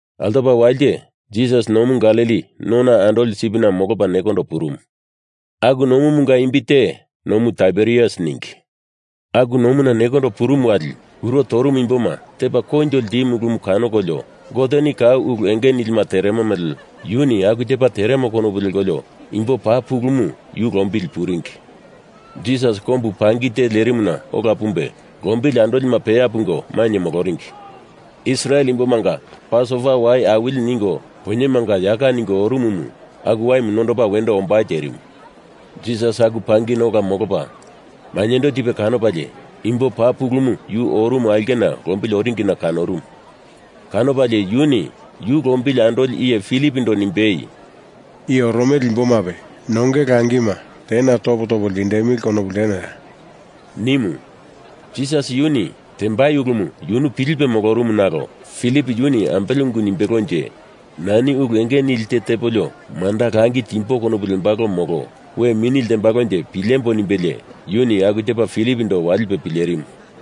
Altopa walite Jisas Nomu Galili nona andoli sipina molopa nekondo purumu. Aku nomunga imbi te Nomu Taiberias ningi. Aku nomuna nekondo purumu wali kuro torumu imboma tepa koinjo ltimu ulumu kanokolio Goteni kau ulu enge nilima teremo mele yuni aku tepa teremo konopu lekolio imbo paa pulumu yu lombili puringi. Jisas kombu pangi te lerimuna ola pumbe lombili andolima peya pungo mainye moloringi. Israel imbomanga Pasova Wai Awili ningo poinyemanga yaka ningo orumumu aku waimu nondopa wendo ombai terimu. Jisas aku pangina ola molopa mainyendo tipe kanopalie imbo paa pulumu yu orumu aulkena lombili oringina kanorumu. Kanopalie yuni yu lombili andoli iye Filipondo nimbei, “I oromele imbomape nongei langima tena topo topo ltindemili konopu ltenoya?” nimu. Jisas yuni tembai ulumu yunu pilipe molorumu nalo Filip yuni ambele ungu nimbelonje, nani ulu enge nili te tepolio manda langi timbo konopu lembalo molo we mini ltembalonje pilembo nimbelie yuni aku tepa Filipondo walipe pilerimu.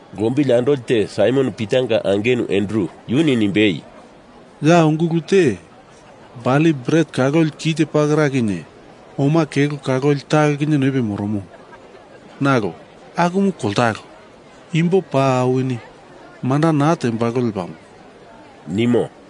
Lombili andoli te Saimon Pitanga angenu Andru, yuni nimbei, “Ya ungulu te bali bret kaloli kelo kite pakera kinye oma kelo kaloli talo kinye noipe moromo. Nalo akumu koltalo, imbo paa awini. Manda naa tembalo lepamo,” nimo.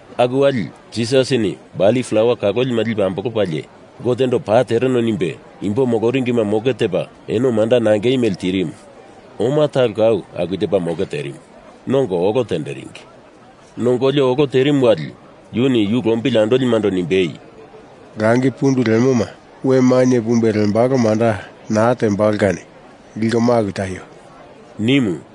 Aku wali Jisasini bali plawa kalolima lipe ambolopalie Gotendo paa tereno nimbe imbo moloringima moke tepa eno manda nangei mele tirimu. Oma talo kau aku tepa moke terimu. Nongo olo tenderingi. Nongolio olo terimu wali yuni yu lombili andolimando nimbei, “Langi pundu lemoma we mainye pumbe lembalo manda naa tembalo kani liko maku taio!” nimu.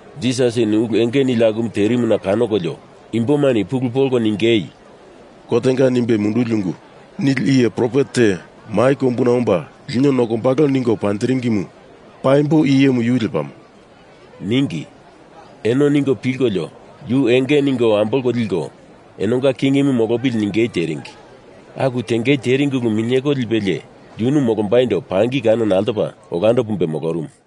Jisasini ulu enge nili akumu terimuna kanokolio imbomani pulu polko ningei, “Gotenga nimbe munduli ungu nili iye profet te mai kombuna omba lino nokombalo ningo panjiringimu paimbo i iyemu yu lepamo,” ningi. Eno ningo pilkolio yu enge ningo ambolko liko enonga kingimu molopili ningei teringi. Aku tengei teringi ulu minyeko lipelie yunu molombaindo pangi kanona altopa olando pumbe molorumu.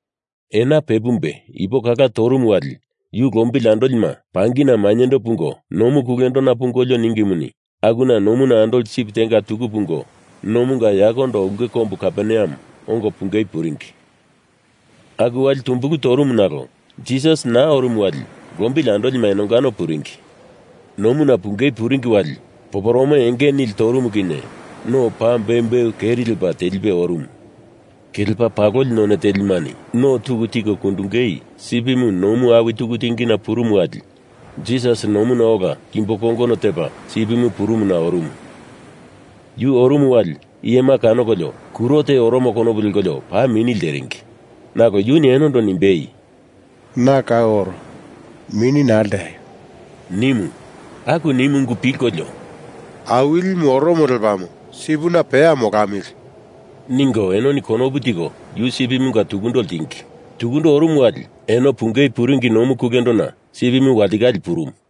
Ena pe pumbei ipo kala torumu wali yu lombili andolima pangina mainyendo pungo nomu kulendona pungolio ningimuni, akuna nomuna andoli sip tenga tuku pungo nomunga yakondo ulke kombu Kaperneam ongo pungei puringi. Aku wali tumbulu torumu nalo Jisas naa orumu wali lombili andolima enongano puringi. Nomuna pungei puringi wali poporome enge nili torumu kinye no paa beumbeu keri lepa telipe orumu. Kelepa paloli none telimani no tuku tiko kundungei sipimu nomu awi tuku tingina purumu wali Jisas nomuna ola kimbo kongono tepa sipimu purumuna orumu. Yu orumu wali iyema kanokolio kuro te oromo konopu lekolio paa mini lteringi. Nalo yuni enondo nimbei, “Na kau oro. Mini naa lteaio!” nimu. Aku nimu ungu pilkolio “Awilimu oromo lepamo sipina peya molamili!” ningo enoni konopu tiko yu sipimunga tukundo ltingi. Tukundo orumu wali eno pungei puringi nomu kulendona sipimu walitikale purumu.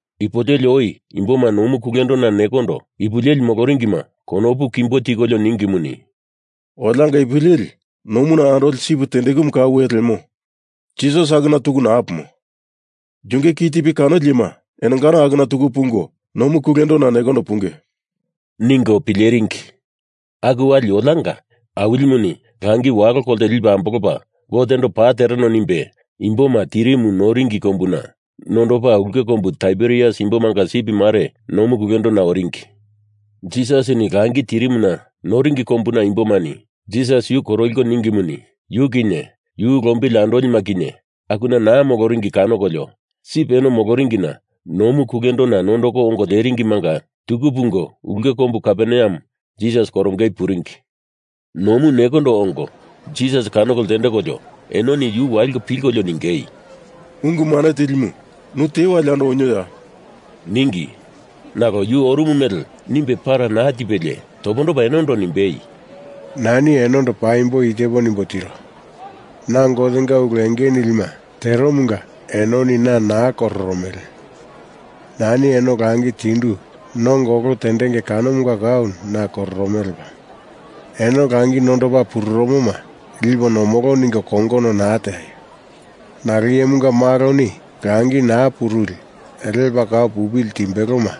Ipu leli oi imboma nomu kulendona nekondo ipu leli moloringima konopu kimbo tikolio ningimuni “Olianga ipu leli nomuna andoli sip tendeku kau ya lemo, Jisas akuna tuku naa pumo. Yunge ki tipi kanoli iyema enongano akuna tuku pungo nomu kulendona nekondo punge,” ningo pileringi. Aku wali olianga Awilimuni langi walo kolte lipe ambolopa Gotendo paa tereno nimbe imboma tirimu noringi kombuna nondopa ulke kombu Taiberias imbomanga sip mare nomu kulendona oringi. Jisasini langi tirimuna noringi kombuna imbomani Jisas yu korokolio ningimuni, yu kinye yu lombili andolima kinye akuna naa moloringi kanokolio sip eno moloringina nomu kulendona nondoko ongo leringimanga tuku pungo ulke kombu Kaperneam Jisas korongei puringi. Nomu nekondo ongo Jisas kanoko ltendekolio enoni yu waliko pilkolio ningei, “Ungu Mane Tilimu, nu te wali yando onioya?” ningi. Nalo yu orumu mele nimbe para naa tipelie topondopa enondo nimbei, “Nani enondo paimbo i tepo nimbo tiro. Na Gotenga ulu enge nilima teromunga enoni na naa kororomele. Nani eno langi tindu nongo olo tendenge kanomunga kau na kororomele lepamo. Eno langi nondopa pururumoma lipo nomolo ningo kongono naa teaio! Nalo Iyemunga Maloni langi naa puruli lepa kau pupili timbeloma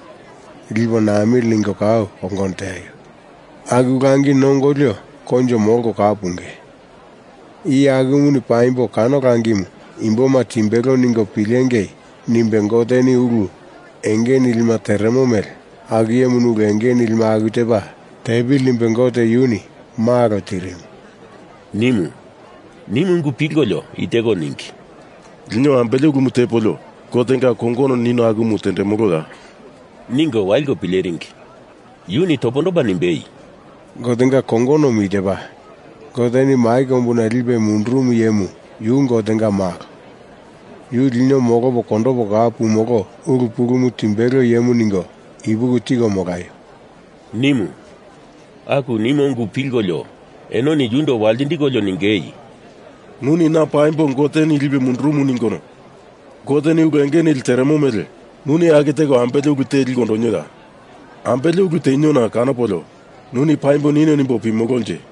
lipo namili ningo kau kongono teaio. Aku langi nongolio koinjo molko kau punge. Iye akumuni paimbo kano langimu imboma timbelo ningo pilengei nimbe Goteni ulu enge nilima teremo mele aku iyemuni ulu enge nilima aku tepa tepili nimbe Gote yuni Malo tirimu,” nimu. Nimu ungu pilkolio i teko ningei, “Lino ambele ulumu tepolio Gotenga kongono nino akumu tendemoloya?” ningo waliko pileringi. Yuni topondopa nimbei, “Gotenga kongonomu i tepa: Goteni mai kombuna lipe mundurumu iyemu yu Gotenga malo, yu lino molopo kondopo kau pumolo ulu pulumu timbelo iyemu ningo ipuki tiko molaio!” nimu. Aku nimo ungu pilkolio enoni yundo waltindikolio ningei, “Nuni na paimbo Goteni lipe mundurumu ningono Goteni ulu enge nili teremo mele nuni aku teko ambele ulu te liko ondonioya! Ambele ulu teniona kanopolio nuni paimbo nino nimbo pimolonje?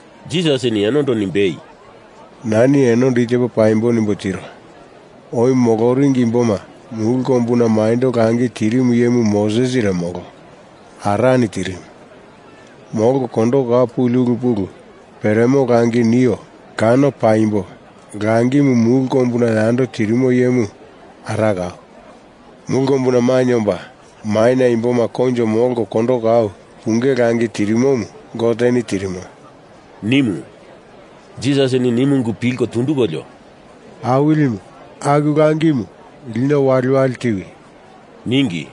Jisasini enondo nimbei, “Nani enondo i tepo paimbo nimbo tiro. Oi moloringi imboma mulu kombuna maindo langi tirimu iyemu Mosesire molo. Arani tirimu. Molko kondoko kau puli ulu pulu peremo langi nio kano paimbo langimu mulu kombuna yando tirimo iyemu Ara kau. Mulu kombuna mainye omba maina imboma koinjo molko kondoko kau punge langi tirimomu Goteni tirimo,” nimu. Jisasini nimu ungu pilko tundukolio, “Awilimu, aku langimu lino waliwali tiwi!” ningi.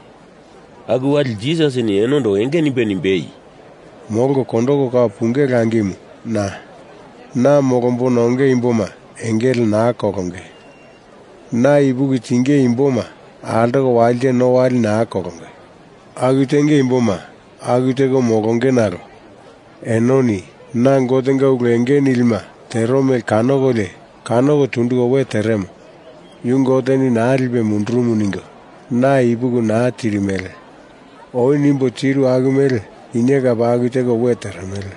Aku wali Jisasini enondo enge nimbe nimbei, “Molko kondoko kau punge langimu na. Na molombona onge imboma engele naa kolonge. Na ipuki tinge imboma altoko walite no wali naa kolonge. Aku tenge imboma aku teko molonge nalo enoni na Gotenga ulu enge nilima tero mele kanokolio kanoko tunduko we teremo, yu Goteni naa lipe mundurumu ningo na ipuki naa tirimele oi nimbo tiru aku mele kinye kape aku teko we teremele.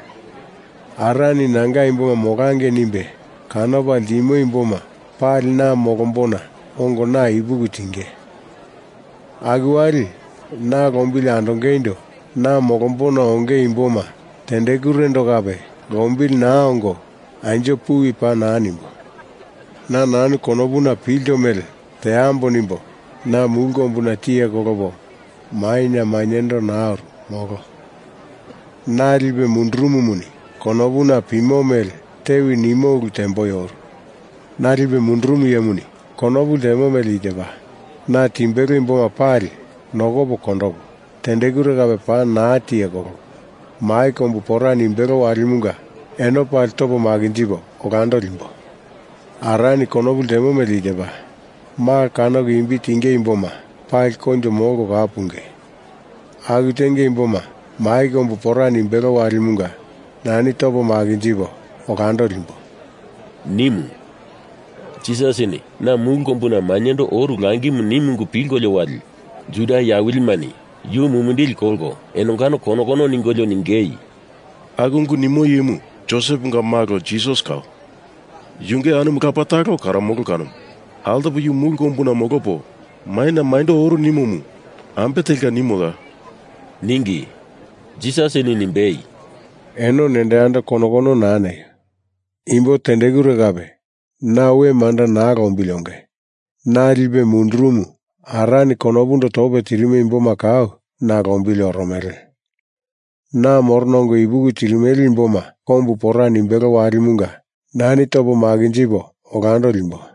Arani Nanga imboma molangei nimbe kanopa ltimo imboma pali na molombona ongo na ipuki tinge. Aku wali na lombili andongeindo na molombona onge imboma tendekurendo kape lombili naa ongo anjo puwi paa naa nimbo. Na nanu konopuna pilto mele teambo nimbo na mulu kombuna tiye kolopo maina mainyendo naa oru, molo. Na lipe mundurumumuni konopuna pimo mele tewi nimo ulu temboi oru. Na lipe mundurumu iyemuni konopu ltemo mele i tepa: Na timbelo imboma pali nokopo kondopo, tendekure kape paa naa tiye kolopo, mai kombu pora nimbelo walimunga eno pali topa makinjipo olando limbo! Arani konopu ltemo mele i tepa Malo kanoko imbi tinge imboma pali koinjo molko kau punge. Aku tenge imboma mai kombu pora nimbelo walimunga nani topo makinjipo olando limbo,” nimu. Jisasini na mulu kombuna mainyendo oru langimu nimu ungu pilkolio wali Juda iye awilimani yu mumindili kolko enongano kono kono ningolio ningei, “Aku ungu nimo iyemu Joseponga malo Jisas kau. Yunge anumu lapa talo karomolo kanomu. Altopa yu mulu kombuna molopo maina mainyendo oru nimomu ambe telka nimoya?” ningi. Jisasini nimbei, “Eno nendo yando kono kono naa neio! Imbo tendekure kape na we manda naa lombili onge. Na lipe mundurumu Arani konopundo tope tirimo imboma kau na lombili oromele. Na morona ongo ipuki tirimele imboma kombu pora nimbelo walimunga nani topo makinjipo olando limbo.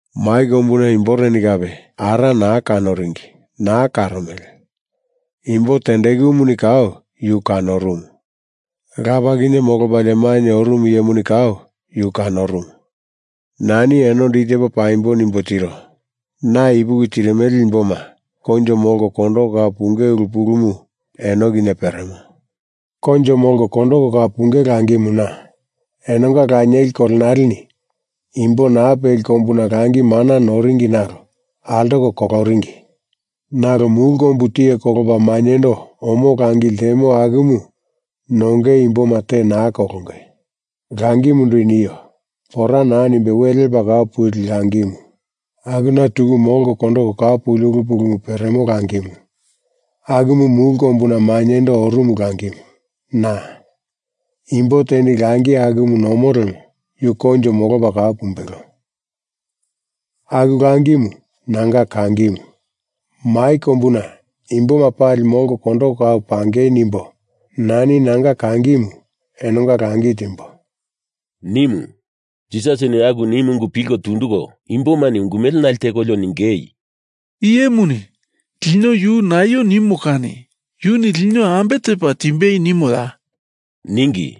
Mai kombuna imboreni kape Ara naa kanoringi, naa karomele. Imbo tendekumuni kau yu kanorumu. Lapa kinye molopalie mainye orumu iyemuni kau yu kanorumu. Nani enondo i tepo paimbo nimbo tiro. Na ipuki tirimele imboma koinjo molko kondoko kau punge ulu pulumu eno kinye peremo. Koinjo molko kondoko kau punge langimu, na. Enonga lanieli kolenaleni imbo naa peli kombuna langi mana noringi nalo altoko koloringi. Nalo mulu kombu tiye kolopa mainyendo omo langi ltemo akumu nongei imboma te naa kolonge. Langimundo i nio. Pora naa nimbe we lepa kau puli langimu, akuna tuku molko kondoko kau puli ulu pulumu peremo langimu, akumu mulu kombuna mainyendo orumu langimu, na. Imbo teni langi akumu nomo lemo, yu koinjo molopa kau pumbelo. Aku langimu, nanga kangimu. Mai kombuna imboma pali molko kondoko kau pangei nimbo nani nanga kangimu enonga langi timbo,” nimu. Jisasini aku nimu ungu pilko tunduko imbomani ungu mele nale tekolio ningei, “I iyemuni lino yu naio nimo kani yuni lino ambe tepa timbei nimoya?” ningi.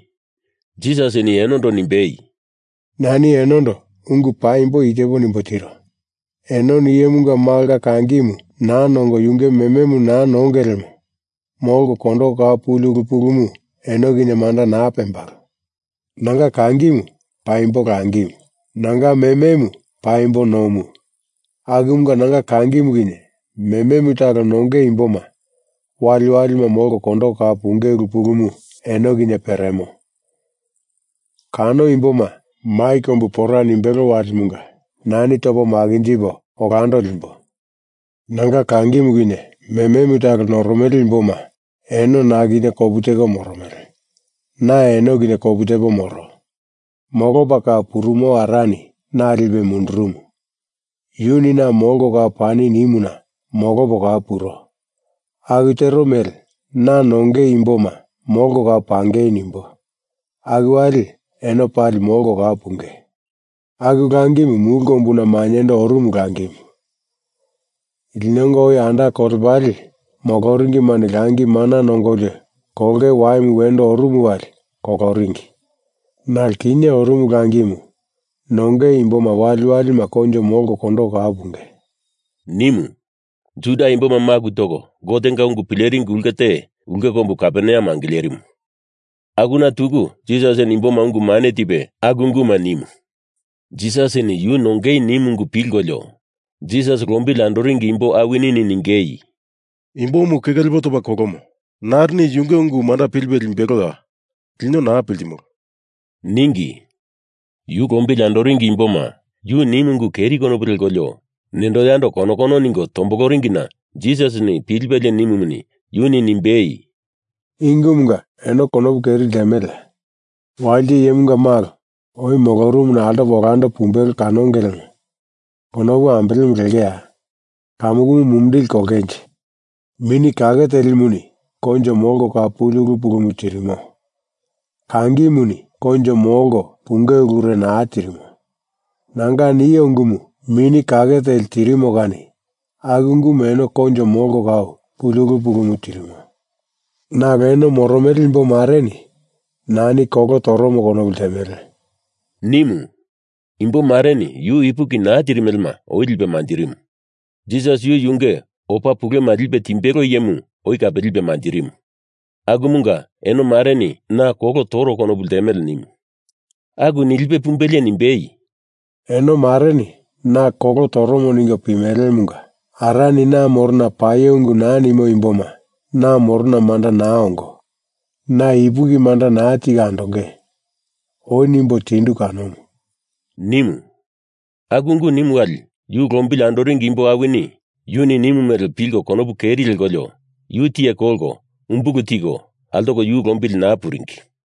Jisasini enondo nimbei, “Nani enondo ungu paimbo i tepo nimbo tiro. Enoni Iyemunga Malonga kangimu naa nongo yunge mememu naa nongei lemo molko kondoko kau puli ulu pulumu eno kinye manda naa pembalo. Nanga kangimu paimbo langimu, nanga mememu paimbo nomu akumunga nanga kangimu kinye mememu talo nongei imboma waliwalima molko kondoko kau punge ulu pulumu eno kinye peremo. Kano imboma mai kombu pora nimbelo walimunga nani topo makinjipo olando limbo. Nanga kangimu kinye mememu talo noromele imboma eno na kinye kopu teko moromele, na eno kinye kopu tepo moro. Molopa kau purumo Arani na lipe mundurumu, yuni na molko kau pani nimuna molopo kau puro, aku tero mele na nongei imboma molko kau pangei nimbo, aku wali eno pali molko kau punge. Aku langimu mulu kombuna mainyendo orumu langimu. Linonga oi anda kolepale moloringimani langi mana nongolio kolonge waima wendo orumu wali koloringi, nalo kinye orumu langimu nongei imboma waliwalima koinjo molko kondoko kau punge,” nimu. Juda imboma maku toko Gotenga ungu pileringi ulke te, ulke kombu Kaperneam angilerimu, akuna tuku Jisasini imboma ungu mane tipe aku unguma nimu. Jisasini yu nongei nimu ungumu pilkolio Jisas lombili andoringi imbo awini ningei, “Imbomu keke lepo topa kolomo. Narini yunge ungu manda pilipe limbeloya? Lino naa piltimolo,” ningi. Yu lombili andoringi imboma yu nimu ungu keri konopu lekolio nendo yando kono kono ningo tomboloringina Jisasini pilipelie nimumuni yuni nimbei, “I ungumunga eno konopu keri ltemeleya? Walite Iyemunga Malo oi molorumuna altopa olando pumbelo kanonge lemo konopu ambelemu lengeya? Kamukumu mumindili kolongenje? Mini Kake Telimuni koinjo molko kau puli ulu pulumu tirimo; kangimuni koinjo molko punge ulure naa tirimo. Nanga nio ungumu Mini Kake Teli tirimo kani aku ungumuni eno koinjo molko kau puli ulu pulumu tirimo. Nalo eno moromele imbo mareni nani kolo toromo konopu ltemele,” nimu. Imbo mareni yu ipuki naa tirimelema oi lipe manjirimu. Jisas yu yunge opa pulema lipe timbelo iyemu oi kape lipe manjirimu. Akumunga eno mareni na kolo toro konopu ltemele nimu. Aku nilipe pumbelie nimbei, “Eno mareni na kolo toromo ningo pimelemunga Arani na morona paio ungu naa nimo imboma na morona manda naa ongo, na ipuki manda naa tiko andonge oi nimbo tindu kanomu,” nimu. Aku ungu nimu wali yu lombili andoringi imbo awini yuni nimu mele pilko konopu keri lekolio yu tiye kolko umbulu tiko altoko yu lombili naa puringi.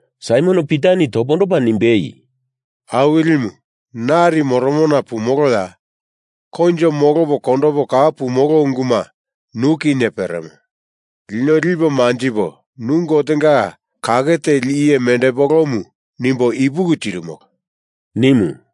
Saimon Pitani topondopa nimbei, “Awilimu nari moromona pumoloya? Koinjo molopo kondopo kau pumolo unguma nu kinye peremo. Lino lipo manjipo nu Gotenga Kake Teli Iye mendepolomu nimbo ipuki tirimolo,” nimu.